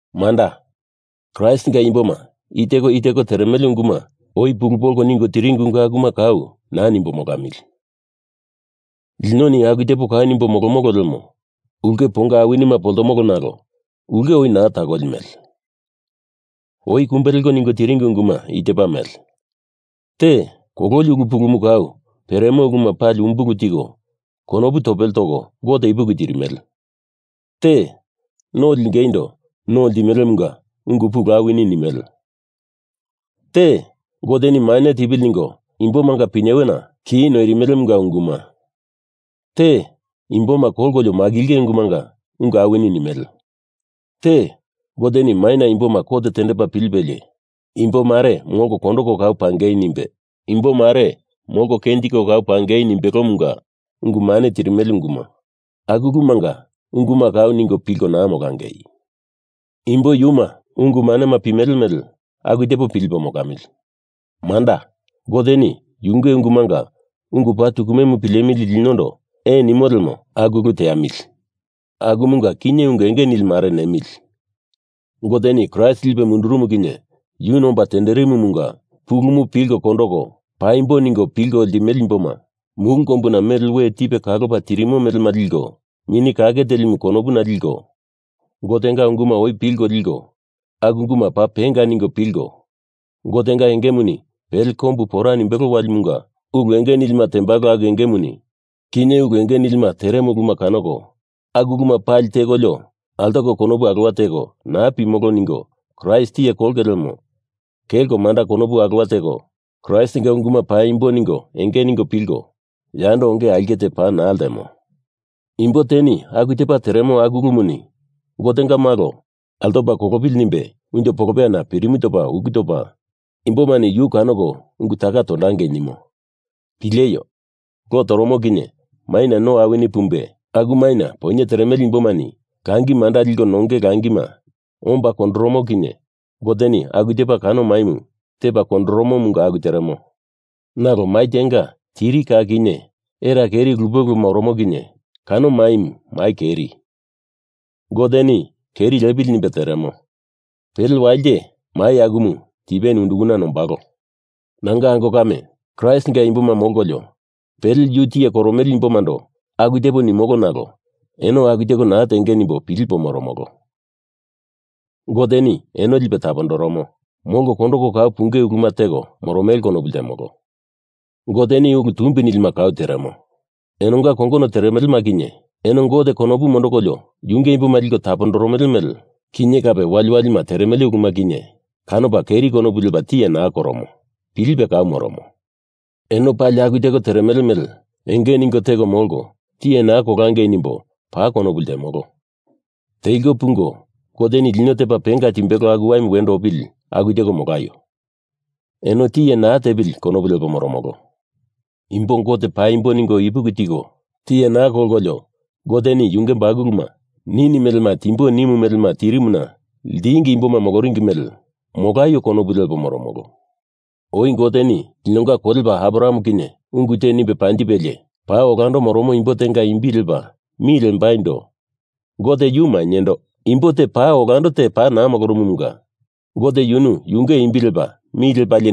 Manda, Kraistinga imboma i teko i teko teremele ungumu oi pulu polko ningo tiringi ungu akuma kau naa nimbo molamili. Linoni aku tepo kau nimbo molomolo lemo ulke ponga awinima poltomolo nalo ulke oi naa takoli mele. Oi kumbe leko ningo tiringi unguma i tepa mele: Te, kololi ulu pulumu kau peremo uluma pali umbulu tiko konopu topele toko Gote ipuki tirimele. Te, no lingeindo no ltimelemunga ungu pulu awini nimele. Te, Goteni mane tipili ningo imbomanga pinyewena ki noirimelemunga unguma. Te, Imboma kolkolio makilinge ulumunga ungu awini nimele. Te, Goteni maina imboma kot tendepa pilipelie imbo mare molko kondoko kau pangei nimbe, imbo mare molko kenjiko kau pangei nimbelomunga ungu mane tirimele unguma. Aku ulumanga unguma kau ningo pilko naa molangei. Imbo yuma ungu manema pimele mele aku tepo pilipo molamili. Manda, Goteni yunge ungumanga ungu paa tukume pilemili linondo ee nimo lemo, aku ulu teamili. Akumunga kinye ungu enge nili mare nemili. Goteni Kraist lipe mundurumu kinye yuni omba tenderimumunga pulumu pilko kondoko paimbo ningo pilko limele imboma mulu kombuna mele we tipe kalopa tirimo melema liko, Mini Kake Telimu konopuna liko, Gotenga ungumu oi pilko likolio aku ungumu paa penga ningo pilko, Gotenga engemuni pele kombu pora nimbelo walimunga ulu enge nilima tembalo aku engemuni kinye ulu enge nilima teremo uluma kanoko, aku uluma pali tekolio altoko konopu alowa teko naa pimolo ningo Kraist tiye kolonge lemo kelko manda konopu alowa teko Kraistinga unguma paimbo ningo enge ningo pilko yando onge aulke te paa naa ltemo. Imbo teni aku tepa teremo aku ulumuni Gotenga Malo altopa kolopili nimbe unjo polopeyana pirimu topa uku topa, imbomani yu kanoko ungu taka tondongei nimo. Pileio! Lo toromo kinye maina no awini pumbe, aku maina poinye teremele imbomani langi manda liko nonge langima omba kondoromo kinye Goteni aku tepa kano maimu tepa kondoromomunga aku teremo. Nalo mai tenga tiri ka kinye era keri lupe lupe oromo kinye kano maimu mai keri. Goteni keri lepili nimbei teremo. Pele wali te mai akumu tipeni undukana nombalo. Nanga ango kame, Kraistinga imboma molkolio pele yu tiye koromele imbomando aku tepo nimolo nalo eno aku teko naa tenge nimbo pilipo moromolo. Goteni eno lipe tapondoromo, molko kondoko kau punge uluma teko moromele konopu ltemolo. Goteni ulu tumbi nilima kau teremo. Enonga kongono teremelema kinye, eno Gote konopu mondokolio yunge imboma liko tapondoromele mele kinye kape waliwalima teremele uluma kinye, kanopa keri konopu lepa tiye naa koromo. Pilipe kau moromo. Eno pali aku teko teremele mele enge ningo teko molko tiye naa kolangei nimbo paa konopu ltemolo. Teliko pungo Goteni lino tepa penga timbelo aku waimu wendo opili aku teko molaio Eno tiye naa tepili konopu lepo moromolo. Imbo Gote paimbo ningo ipuki tiko tiye naa kolkolio Goteni yunge bakuluma nini melema timbo nimu melema tirimuna ltingi imboma moloringi mele molaio konopu lepo moromolo. Oi Goteni linonga kolepa Abraham kinye ungu te nimbe panjipelie, paa olando moromo imbo tenga imbi lepa mi lembaindo Gote yu mainyendo imbo te paa olando te naa molorumumunga Gote yunu yunge imbi lepa mi lepalie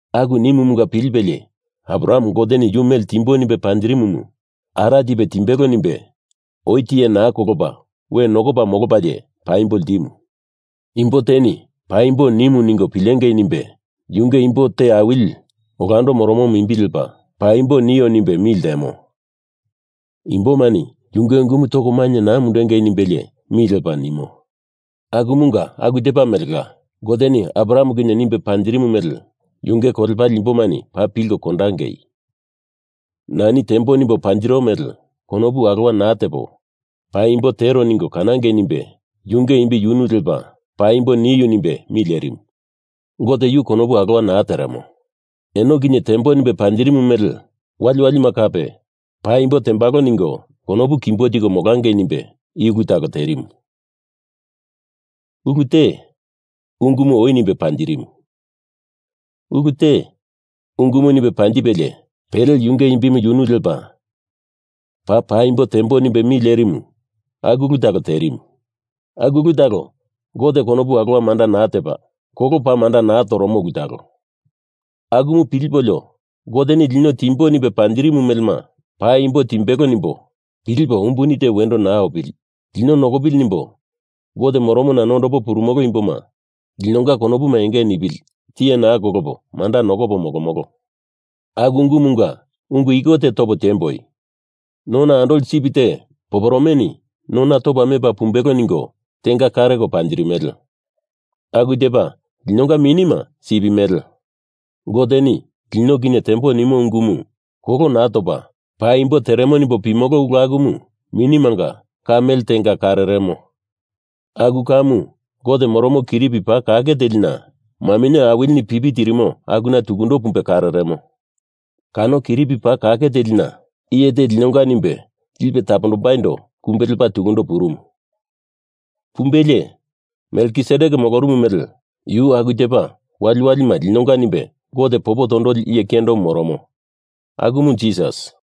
Aku nimumunga pilipelie Abraham Goteni yu mele timbo nimbe panjirimumu ara tipe timbelo nimbe oi tiye naa kolopa we nokopa molopalie paimbo ltimu. Imbo teni paimbo nimu ningo pilengei nimbe yunge imbo te awili olando moromomu imbi lepa paimbo nio nimbe mi ltemo. Imbomani yunge ungumu toko mainye naa mundundengei nimbelie mi lepa nimo. Akumunga aku tepa melela, Goteni Abraham kinye nimbo panjiru mele yunge kolepale imbomani paa pilko kondangei. Nani tembo nimbo panjiro mele konopu alowa naa tepo paimbo tero ningo kanangei nimbe yunge imbi yunu lepa paimbo niu nimbe mi lerimu. Gote yu konopu alowa naa teremo. Eno kinye tembo nimbo panjirimu mele waliwalima kape paimbo tembalo ningo konopu kimbo tiko molangei nimbe i ulu talo terimu. Ulu te, ungumu oi nimbe panjirimu. Ulu te, ungumu nimbe panjipelie pele yunge imbi yunu lepa paa paimbo tembo nimbe mi lerimu aku ulu talo terimu. Aku ulu talo Gote konopu alowa manda naa tepa, kolo paa manda naa toromo ulu talo. Akumu pilipolio Goteni lino timbo nimbe panjirimu melema paimbo timbelo nimbo pilipo umbuni te wendo naa opili, lino nokopili nimbo Gote moromona nondopo purumolo imboma linonga konopu enge nipili tiye naa kolopo manda nokopo molomolo. Aku ungumunga ungu iko te topo tiembo, nona andoli sip te poporomeni nona topa mepa pumbelo ningo tenga kareko panjirimele. Aku tepa linonga minima sip mele. Goteni lino kinye tembo nimo ungumu kolo naa topa paimbo teremo nimbo pimolo ulu akumu minimanga ka mele tenga kareremo. Aku kamu Gote moromo kiripi paa kake telina, maminye awilini pipi tirimo, akuna tukundo pumbe kareremo. Kano kiripi paa kake telina iye te linonga nimbe lipe tapondombaindo kumbe lepa tukundo purumu. Pumbelie Melkisedek molorumu mele yu aku tepa waliwalima linonga nimbe Gote popo tondoli iye kiyendomu moromo, akumu Jisas.